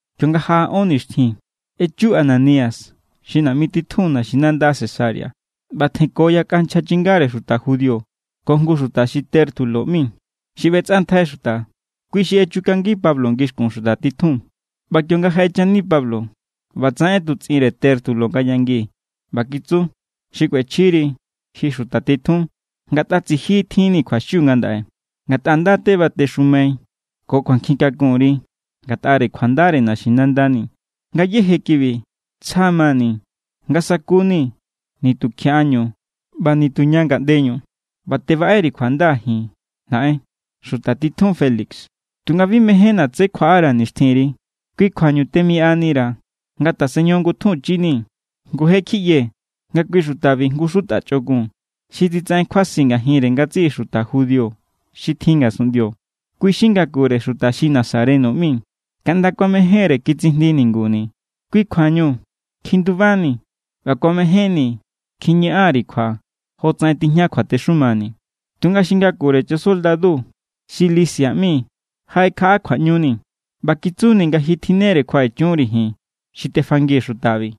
Kionga jaꞌa ón nixtjin, echu Ananías xi naꞌmi titjun naxinanda Cesarea, ꞌba tjenko yakꞌa nchja chingare xuta judío ko jngu xuta xi Tértulo ꞌmi, xi ꞌbetsꞌantjai xuta. Kui xi echukangi Pablo ngixkun xuta titjun. ꞌBa kionga jaꞌechani Pablo, ꞌbatsaꞌen ꞌetutsꞌinre Tértulo nga yangi ꞌba kitsu: —Xikꞌuechjiri, ji xuta titjun, ngatꞌa tsiji tjinni̱ kjuaxiu ngandaꞌe ngatꞌa nda= tebatexumai ko kjuankjin kakunri ngatꞌare kjuandare naxinandani̱. Ngayéje kibi tsja mani̱ nga sakuni̱ nitukjiaꞌañu ꞌba nituña ngaꞌndeñu ꞌba tebaꞌeri̱ kjuanda ji naꞌen, xuta titjun Félix. Tunga bi mejénna̱ tsé kjuaꞌara̱ nixtjinri. Kui kjuañu temiꞌanira̱ nga ta̱sen ñojon ngutjunchinii̱. ’Ngu je= kjiꞌyee̱ nga kui xutabi jngu xuta chꞌokun, xi titsaꞌen kjuasi ngajinre ngatsiꞌi xuta judío xi tjin ngasunꞌndio. Kui= xi ngakure xuta xi Nazareno ꞌmi. Kaꞌnda kuamejénre kitsijndi ninguni̱. Kui= kjuañu kjindubani̱ ꞌba kuamejénni̱ kjiñaꞌan_ri̱ kjua jotsaꞌen tijña kjuatexumani̱. Tunga xi ngakure chasoldadu xi Lisias ꞌmi jaꞌekjaꞌa kjuaꞌñuni̱ ꞌba kitsuni̱ nga ji tjinnere kjuaꞌechunri̱ ji̱n xi tefangii̱ xutabi.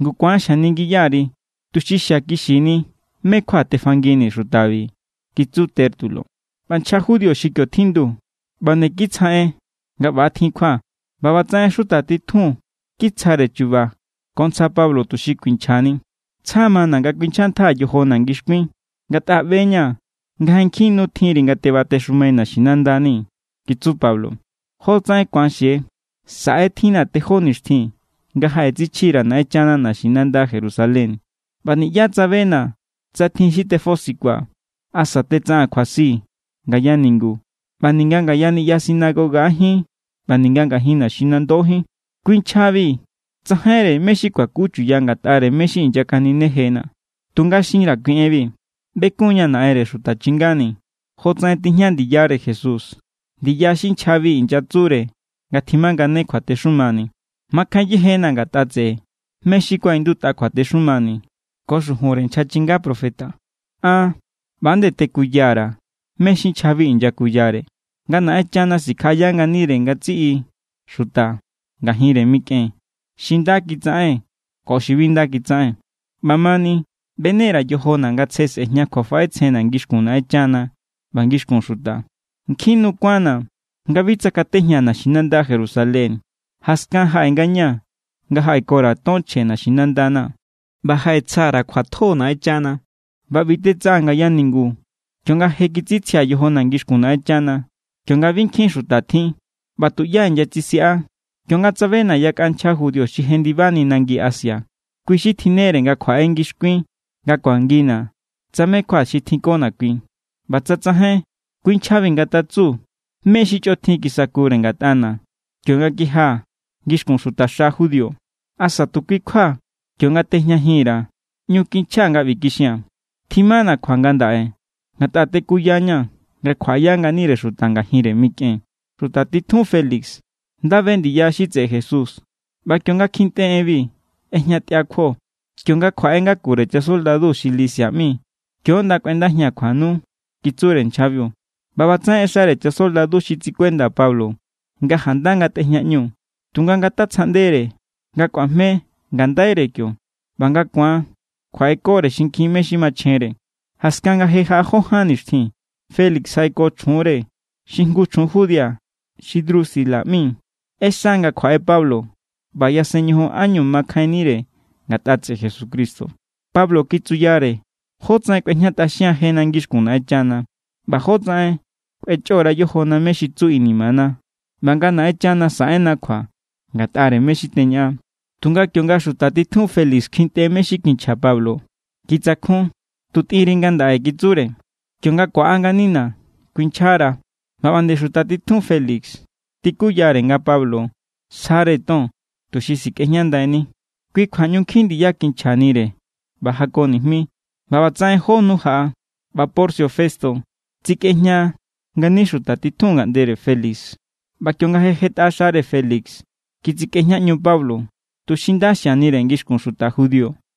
Ngu ku̱an xjaningiya_ri, tuxi xiakixini mé= kjua tefanginii̱ xutabi —kitsu Tértulo. ꞌBa nchja judío xi kio tjindu ꞌba nde kitsja en nga ꞌbatjin kjua. ꞌBa ꞌbatsaꞌen xuta titjun kitsjare chu̱ba̱ ko ntsja Pablo tuxi kuinchjani. —Tsja mana̱ nga kuinchjantjaa̱ yojona̱ ngixkuin, ngatꞌa ꞌbe=ña̱ nga je nkjin nu tjinri nga tebatexumai naxinandani̱ —kitsu Pablo—. Jotsaꞌen ku̱an xie, saꞌe= tjinna̱ tejó nixtjin nga jaꞌetsichji_ra̱ Naꞌenchana naxinanda Jerusalén. ꞌBa niꞌyá tsabena̱ tsa tjin xi tefosikua̱ asa tsa tetsaꞌaa̱n kjuasi ngaya ningu ꞌba ninga ngaya niꞌya sinagogajín ꞌba ninga ngajin naxinandojín. Kui nchjabi tsajainre mé= xi kuakuchuya ngatꞌare mé= xi inyakaninejena̱. ’Tunga xinra̱ kui enbi. Bekunña̱ Naꞌenre xuta chingani̱ jotsaꞌen tijña ndiyare Jesús, ndiya xi nchjabi inyatsure nga tjimangane kjuatexumani̱. Makjain yejena̱ ngatꞌa tseꞌe mé= xi kuaꞌindutꞌa kjuatexumani̱ ko xujunre nchja chinga profeta. An ꞌba nde tekuya_ra̱ mé= xi nchjabi inyakuyare, nga Naꞌenchana sikjaꞌaya nganire ngatsiꞌi xuta ngajinre mikꞌen, xi nda kitsaꞌen ko xi bi nda kitsaꞌen. ꞌBamani, ꞌbene_ra̱ yojona̱ nga tsje sꞌe̱jña kjuafaꞌetsjenna̱ ngixkun Naꞌenchana ꞌba ngixkun xuta. ’Nkjin nu kuánna̱ nga bi tsakatejñaa̱ naxinanda Jerusalén. Jaskan jaꞌe ngañaa̱ nga jaꞌeko_ra̱ ton chje naxinandana̱. ꞌBa jaꞌetsja_ra̱ kjuatjo Naꞌenchana. ꞌBa ꞌbi tetsaꞌaa̱n ngaya ningu kionga je kitsitsjia̱ yojona̱ ngixkun Naꞌenchana, kionga bi nkjin xuta tjin, ꞌba tuꞌyá inyatsisiꞌa. Kio tsabena̱ yakꞌa nchja judío xi jendibani nangi Asia. Kui= xi tjinnere nga kjuaꞌe ngixkuin nga kuangina̱ tsa mé= kjua xi tjinkona̱ kui. ꞌBa tsa tsajain, kui nchjabi ngatatsu mé= xi chꞌotjin kisakure ngatꞌana̱ kionga kijia̱ ngixkun xutaxa judío. Asa tu kui= kjua kio=nga tejñajin_ra̱, ꞌñu kinchjaa̱ nga ꞌbi kixia̱n: “Tjimana̱ kjua ngandaꞌe ngatꞌa tekuyaña̱ nga kjuaꞌaya nganire xuta ngajinre mikꞌen.” Xuta titjun Félix nda be ndiya xi tseꞌe Jesús ꞌba kionga kjintꞌe enbi, ꞌejñatꞌia kjuo. —Kionga kjuaꞌe ngakure chasoldadu xi Lisias ꞌmi, kio= ꞌnda kꞌuendajia̱n kjuanu —kitsure nchjabiu. ꞌBa ꞌbatsaꞌen ꞌexare chasoldadu xi tsikuenda Pablo nga janda ngatꞌejñaꞌñu, tunga ngatatsjaꞌndere nga kꞌuajme ngandaire kio, ꞌba nga ku̱an kjuaꞌekore xinkjin mé= xi machjenre. Jaskan nga je jó ján nixtjin, Félix jaꞌeko chjunre xi jngu chjun judía xi Drusila ꞌmi. ꞌExa nga kjuaꞌe Pablo ꞌba yasen ñojon ánñu makjainnire ngatꞌa tseꞌe Jesucristo. Pablo kitsuyare jótsaꞌen kꞌuejñatꞌaxian jena ngixkun Naꞌenchana, ꞌba jótsaꞌen kꞌuechꞌora yojona mé= xi tsu inimana, ꞌba nga Naꞌenchana saꞌenna kjua ngatꞌare mé= xi teñaꞌan. Tunga kionga xuta titjun Félix kjintꞌe mé= xi kinchja Pablo, kitsakjun. —Tu tꞌinri ngandaꞌe —kitsure—. Kionga ku̱aꞌa nganina̱, kuinchjara̱. ꞌBa ꞌba nde xuta titjun Félix tikuyare nga Pablo sjare ton tuxi sikꞌejñandaini. Kui kjua ꞌñu nkjin ndiya kinchjanire ꞌba jako nijmi. ꞌBa ꞌbatsaꞌen jó nu jaꞌa, ꞌba Porcio Festo tsikꞌejña ngani xuta titjun ngaꞌndere Félix. ꞌBa kionga jetꞌa xare Félix kitsikꞌejñaꞌñu Pablo, tuxi nda xianire ngixkun xuta judío.